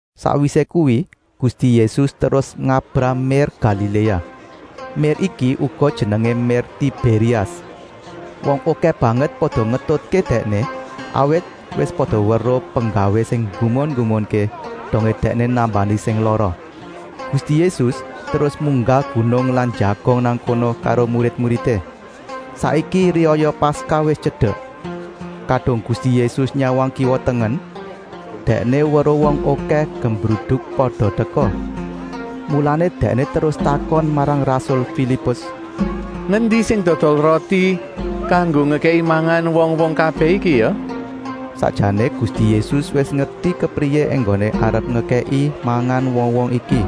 Sakwisé kuwi Gusti Yésus terus ngabrah mér Galiléa. Mér iki uga jenengé mér Tibérias. Wong okèh banget pada ngetutké Dèkné, awit wis pada weruh penggawé sing nggumun-nggumunké, dongé Dèkné nambani sing lara. Gusti Yésus terus munggah gunung lan njagong nang kono karo murid-muridé. Saiki riyaya Paskah wis tyedek. Kadung Gusti Yésus nyawang kiwa-tengen Dèkné weruh wong okèh gemruduk pada teka. Mulané Dèkné terus takon marang rasul Filipus: “Ngendi sing dodol roti kanggo ngekèki mangan wong-wong kabèh iki ya?” Sakjané Gusti Yésus wis ngerti kepriyé enggoné arep ngekèki mangan wong-wong iki,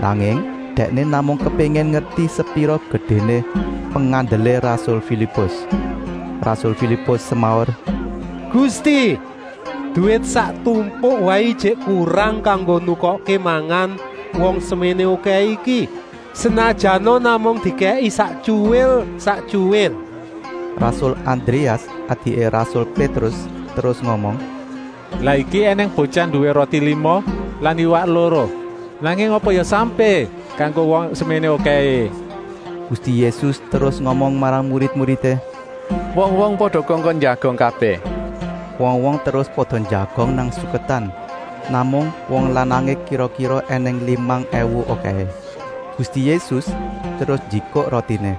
nanging Dèkné namung kepéngin ngerti sepira gedéné pengandelé rasul Filipus. Rasul Filipus semaur: “Gusti, duwit sak tumpuk waé ijik kurang kanggo nukokké mangan wong seméné okèhé iki, senajana namung dikèki saktyuwil-saktyuwil!” Rasul Andréas, adiké rasul Pétrus, terus ngomong: “Lah iki ènèng botyah nduwé roti lima lan iwak loro. Nanging apa ya sampé kanggo wong seméné okèhé?” Gusti Yésus terus ngomong marang murid-muridé: “Wong-wong pada kongkon njagong kabèh!” Wong-wong terus pada njagong nang suketan. Namung wong lanangé kira-kira ènèng limang èwu okèhé. Gusti Yésus terus njikuk rotiné.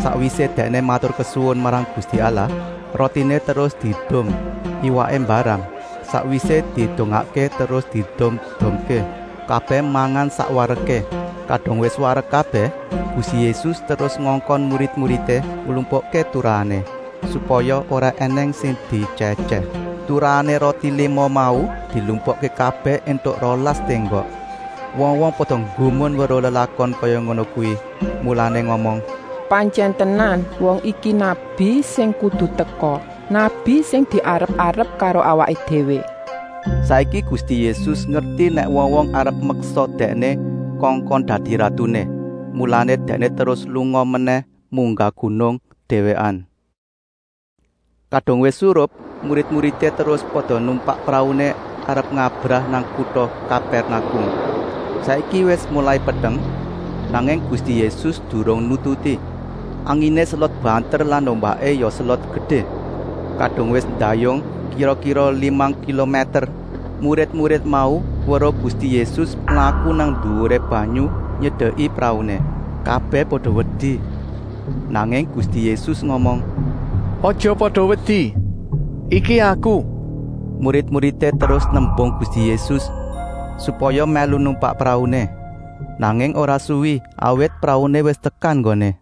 Sakwisé Dèkné maturkesuwun marang Gusti Allah rotiné terus diedum. Iwaké mbarang, sakwisé didongakké terus diedum-edumké. Kabèh mangan sak wareké. Kadung wis warek kabèh Gusti Yésus terus ngongkon murid-muridé nglumpukké turahané, supaya ora ènèng sing dietyèh-etyèh. Turuhané roti lima mau dilumpukké kabèh éntuk rolas ténggok. Wong-wong pada nggumun weruh lelakon kaya ngono kuwi, mulané ngomong: “Pantyèn tenan, wong iki nabi sing kudu teka, nabi sing diarep-arep karo awaké déwé.” Saiki Gusti Yésus ngerti nèk wong-wong arep meksa Dèkné kongkon dadi ratuné, mulané Dèkné terus lunga menèh munggah gunung, déwékan. Kadung wis surup murid-muridé terus pada numpak prauné arep ngabrah nang kuta Kapèrnakum. Saiki wis molai peteng, nanging Gusti Yésus durung nututi. Anginé selot banter lan ombaké ya selot gedé. Kadung wis ndayung kira-kira limang kilomèter murid-murid mau weruh Gusti Yésus mlaku nang nduwuré banyu nyedeki prauné. Kabèh pada wedi. Nanging Gusti Yésus ngomong: “Aja pada wedi! Iki Aku!” Murid-muridé terus nembung Gusti Yésus supaya mèlu numpak prauné. Nanging ora suwi, awit prauné wis tekan nggoné.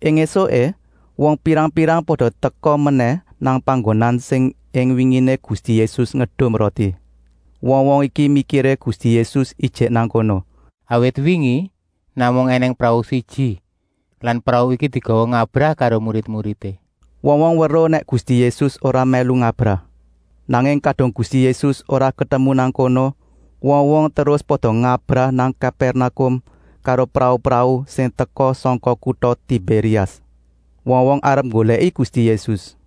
Ing ésuké wong pirang-pirang pada teka menèh nang panggonan sing ing winginé Gusti Yésus ngedum roti. Wong-wong iki mikiré Gusti Yésus ijik nang kono, awit wingi namung ènèng prau siji lan prau iki digawa ngabrah karo murid-muridé. Wong-wong weruh nèk Gusti Yésus ora mèlu ngabrah. Nanging kadung Gusti Yésus ora ketemu nang kono, wong-wong terus pada ngabrah nang Kapèrnakum karo prau-prau sing teka sangka kuta Tibérias. Wong-wong arep nggolèki Gusti Yésus.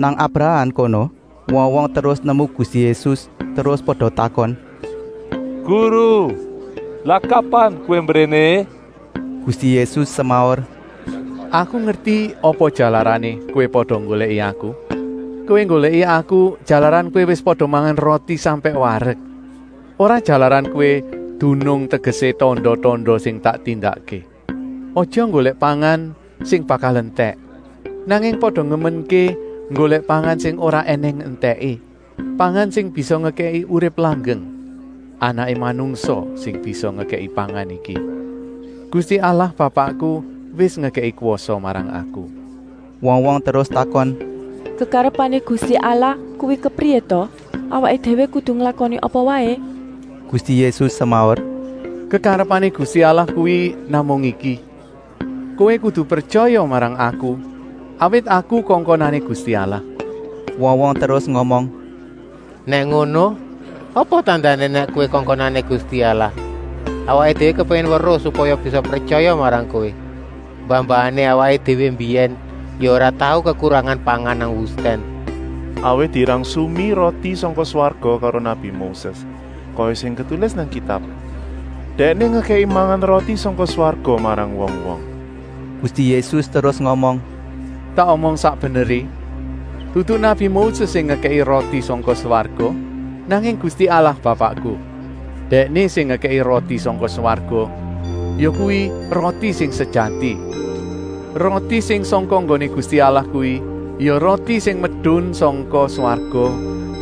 Nang abrahan kono wong-wong terus nemu Gusti Yésus, terus pada takon: “Guru, lah kapan Kowé mbréné?” Gusti Yésus semaur: “Aku ngerti apa jalarané kowé pada nggolèki Aku. Kowé nggolèki Aku jalaran kowé wis pada mangan roti sampèk warek. Ora jalaran kowé dunung tegesé tanda-tanda sing tak tindakké! Aja nggolèk pangan sing bakal entèk, nanging pada nglumui nggolèk pangan sing ora ènèng entèké, pangan sing bisa ngekèki urip langgeng. Anaké Manungsa sing bisa ngekèki pangan iki. Gusti Allah Bapakku wis ngekèki kwasa marang Aku.” Wong-wong terus takon: “Kekarepané Gusti Allah kuwi kepriyé ta? Awaké déwé kudu nglakoni apa waé?” Gusti Yésus semaur: “Kekarepané Gusti Allah kuwi namung iki: kowé kudu pretyaya marang Aku, awit Aku kongkonané Gusti Allah.” Wong-wong terus ngomong: “Nèk ngono, apa tandané nèk Kowé kongkonané Gusti Allah? Awaké déwé kepéngin weruh supaya bisa pretyaya marang Kowé. Mbah-mbahané awaké déwé mbiyèn ya ora tau kekurangan pangan nang wustèn, awit dirangsumi roti sangka swarga karo nabi Moses, kaya sing ketulis nang Kitab: ‘Dèkné ngekèki mangan roti sangka swarga marang wong-wong.’” Gusti Yésus terus ngomong: “Tak omong sak beneré, dudu nabi Moses sing ngekèki roti sangka swarga, nanging Gusti Allah Bapakku. Dèkné sing ngekèki roti sangka swarga, yakuwi roti sing sejati. Roti sing sangka nggoné Gusti Allah kuwi ya roti sing medun sangka swarga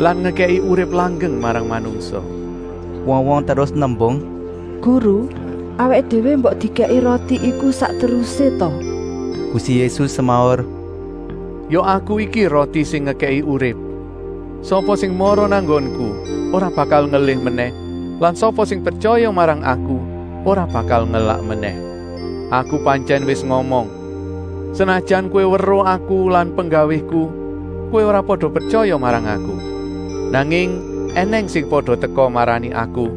lan ngekèki urip langgeng marang manungsa.” Wong-wong terus nembung: “Guru, awaké déwé mbok dikèki roti iku sak terusé ta?” Gusti Yésus semaur: “Ya Aku iki roti sing ngekèki urip. Sapa sing mara nang nggonku ora bakal ngelih menèh lan sapa sing pretyaya marang Aku ora bakal ngelak menèh. Aku pantyèn wis ngomong! Senajan kowé weruh Aku lan penggawéku, kowé ora pada pretyaya marang Aku. Nanging ènèng sing pada teka marani Aku,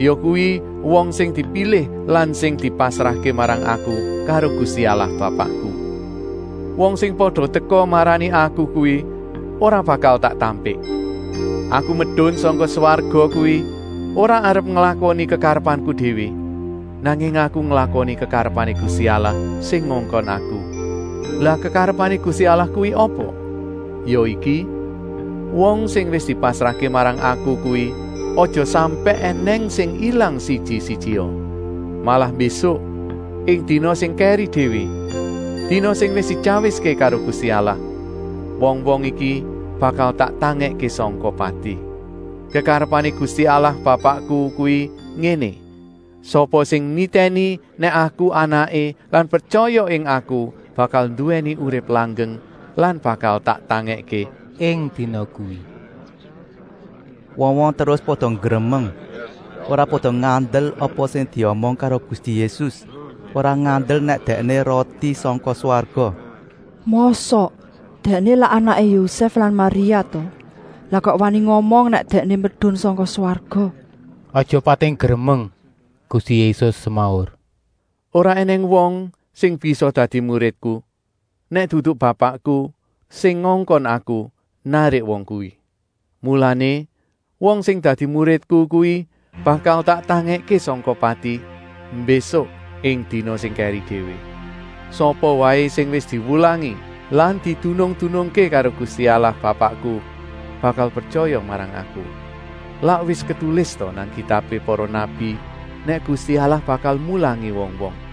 yakuwi wong sing dipilih lan sing dipasrahké marang Aku karo Gusti Allah Bapakku. Wong sing pada teka marani Aku kuwi ora bakal tak tampik. Aku medun sangka swarga kuwi ora arep nglakoni kekarepanku déwé, nanging Aku nglakoni kekarepané Gusti Allah sing ngongkon Aku. Lah kekarepané Gusti Allah kuwi apa? Ya iki: wong sing wis dipasrahké marang Aku kuwi aja sampèk ènèng sing ilang siji-sijia. Malah mbésuk, ing dina sing kèri déwé, dina sing wis dityawiské karo Gusti Allah, wong-wong iki bakal tak tangèkké sangka pati. Kekarepané Gusti Allah Bapakku kuwi ngéné: sapa sing nitèni nèk Aku Anaké lan pretyaya ing Aku bakal nduwèni urip langgeng lan bakal tak tangèkké ing dina kuwi.” Wong-wong terus pada nggremeng. Ora pada ngandel apa sing diomong karo Gusti Yésus, ora ngandel nèk Dèkné roti sangka swarga. “Mosok? Dèkné lak anaké Yosèf lan Maria ta? Lah kok wani ngomong nèk Dèkné medun sangka swarga?” “Aja pada pating gremeng,” Gusti Yésus semaur. “Ora ènèng wong sing bisa dadi muridku, nèk dudu Bapakku, sing ngongkon Aku, narik wong kuwi. Mulané wong sing dadi muridku kuwi bakal tak tangèkké sangka pati, mbésuk ing dina sing kèri déwé. Sapa waé sing wis diwulangi lan didunung-dunungké karo Gusti Allah Bapakku bakal pretyaya marang Aku. Lak wis ketulis ta nang kitabé para nabi nèk Gusti Allah bakal mulangi wong-wong!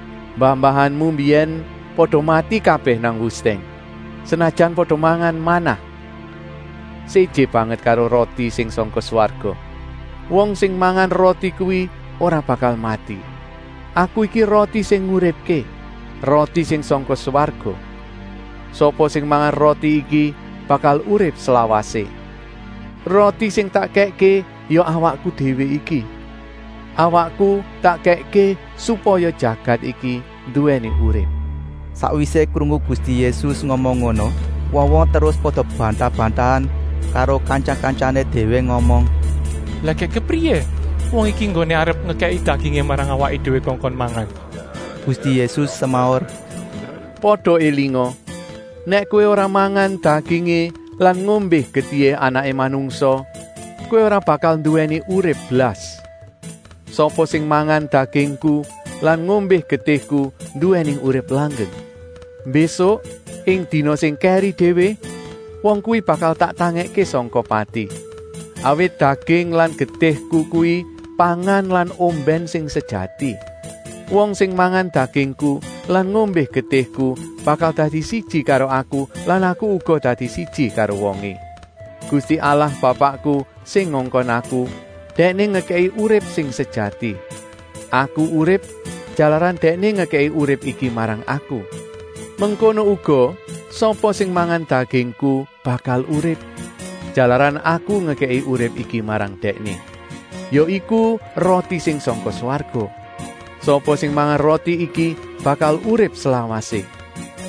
Mbah-mbahanmu mbiyèn pada mati kabèh nang wustèn, senajan pada mangan manah. Séjé banget karo roti sing sangka swarga. Wong sing mangan roti kuwi ora bakal mati. Aku iki roti sing nguripké, roti sing sangka swarga. Sapa sing mangan roti iki bakal urip slawasé. Roti sing tak kèkké ya awakku déwé iki. Awakku tak kèkké supaya jagat iki nduwèni urip.” Sakwisé krungu Gusti Yésus ngomong ngono wong-wong terus pada bantah-bantahan karo kantya-kantyané déwé ngomong: “Lah gèk kepriyé wong iki enggoné arep ngekèkké dagingé marang awaké déwé kongkon mangan?” Gusti Yésus semaur: “Pada élinga! Nèk kowé ora mangan dagingé lan ngombé getihé Anaké Manungsa, kowé ora bakal nduwèni urip blas! Sapa sing mangan dagingku lan ngombé getihku nduwèni urip langgeng. Mbésuk, ing dina sing kèri déwé, wong kuwi bakal tak tangèkké sangka pati. Awit daging lan getihku kuwi pangan lan ombèn sing sejati. Wong sing mangan dagingku lan ngombé getihku bakal dadi siji karo Aku lan Aku uga dadi siji karo wongé. Gusti Allah Bapakku sing ngongkon Aku, Dèkné ngekèki urip sing sejati. Aku urip, jalaran Dèkné ngekèki urip iki marang Aku. Mengkono uga sapa sing mangan dagingku bakal urip, jalaran Aku ngekèki urip iki marang Dèkné. Ya iku roti sing sangka swarga. Sapa sing mangan roti iki bakal urip slawasé.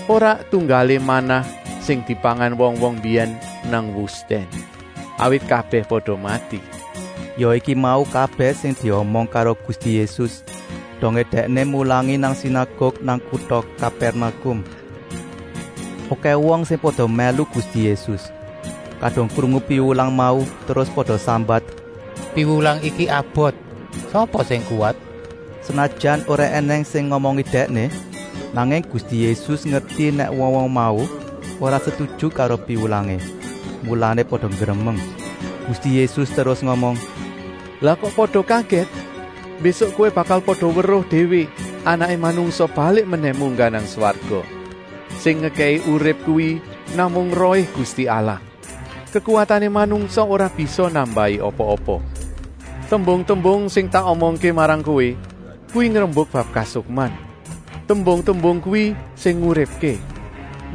Ora tunggalé manah sing dipangan wong-wong mbiyèn nang wustèn. Awit kabèh pada mati.” Ya iku mau kabèh sing diomong karo Gusti Yésus, dongé Dèkné mulangi nang sinaguk nang kuta Kapèrnakum. Okèh wong sing pada mèlu Gusti Yésus. Kadung krungu piwulang mau terus pada sambat: “Piwulang iki abot! Sapa sing kuwat?” Senajan ora ènèng sing ngomongi Dèkné, nanging Gusti Yésus ngerti nèk wong-wong mau ora setuju karo piwulangé, mulané pada nggremeng. Gusti Yésus terus ngomong: “Lah kok pada kagèt? Mbésuk kowé bakal pada weruh déwé Anaké Manungsa balik menèh munggah nang swarga. Sing ngekèki urip kuwi namung Rohé Gusti Allah. Kekuwatané manungsa ora bisa nambahi apa-apa. Tembung-tembung sing tak omongké marang kowé kuwi ngrembuk bab kasukman. Tembung-tembung kuwi sing nguripké.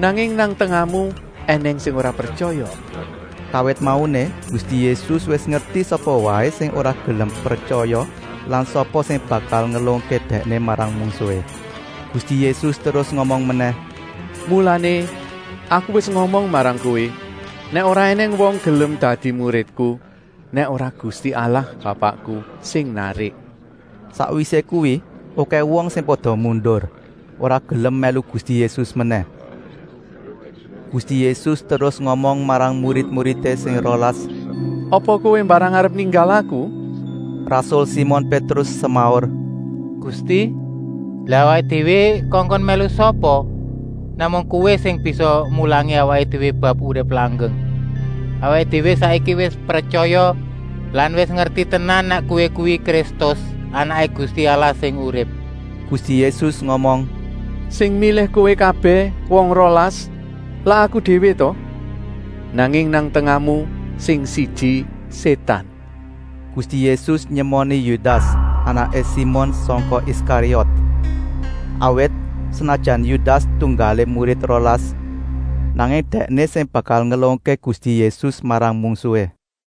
Nanging nang tengahmu ènèng sing ora pretyaya.” Kawit mauné Gusti Yésus wis ngerti sapa waé sing ora gelem pretyaya lan sapa sing bakal ngelungké Dèkné marang mungsuhé. Gusti Yésus terus ngomong menèh: “Mulané Aku wis ngomong marang kowé nèk ora ènèng wong gelem dadi muridku, nèk ora Gusti Allah Bapakku sing narik.” Sakwisé kuwi okèh wong sing pada mundur, ora gelem mèlu Gusti Yésus menèh. Gusti Yésus terus ngomong marang murid sing rolas: “Apa kowé mbarang arep ninggal Aku?” Rasul Simon Pétrus semaur: “Gusti, lah awaké déwé kongkon mèlu sapa? Namung Kowé sing bisa mulangi awaké déwé bab urip langgeng. Awaké déwé saiki wis pretyaya lan wis ngerti tenan nèk Kowé kuwi Kristus, Anaké Gusti Allah sing urip.” Gusti Yésus ngomong: “Sing milih kowé kabèh wong rolas lak Aku déwé ta? Nanging nang tengahmu sing siji Sétan.” Gusti Yésus nyemoni Yudas, anaké Simon sangka Iskariot. Awit, senajan Yudas tunggalé murid rolas, nanging dèkné sing bakal ngelungké Gusti Yésus marang mungsuhé.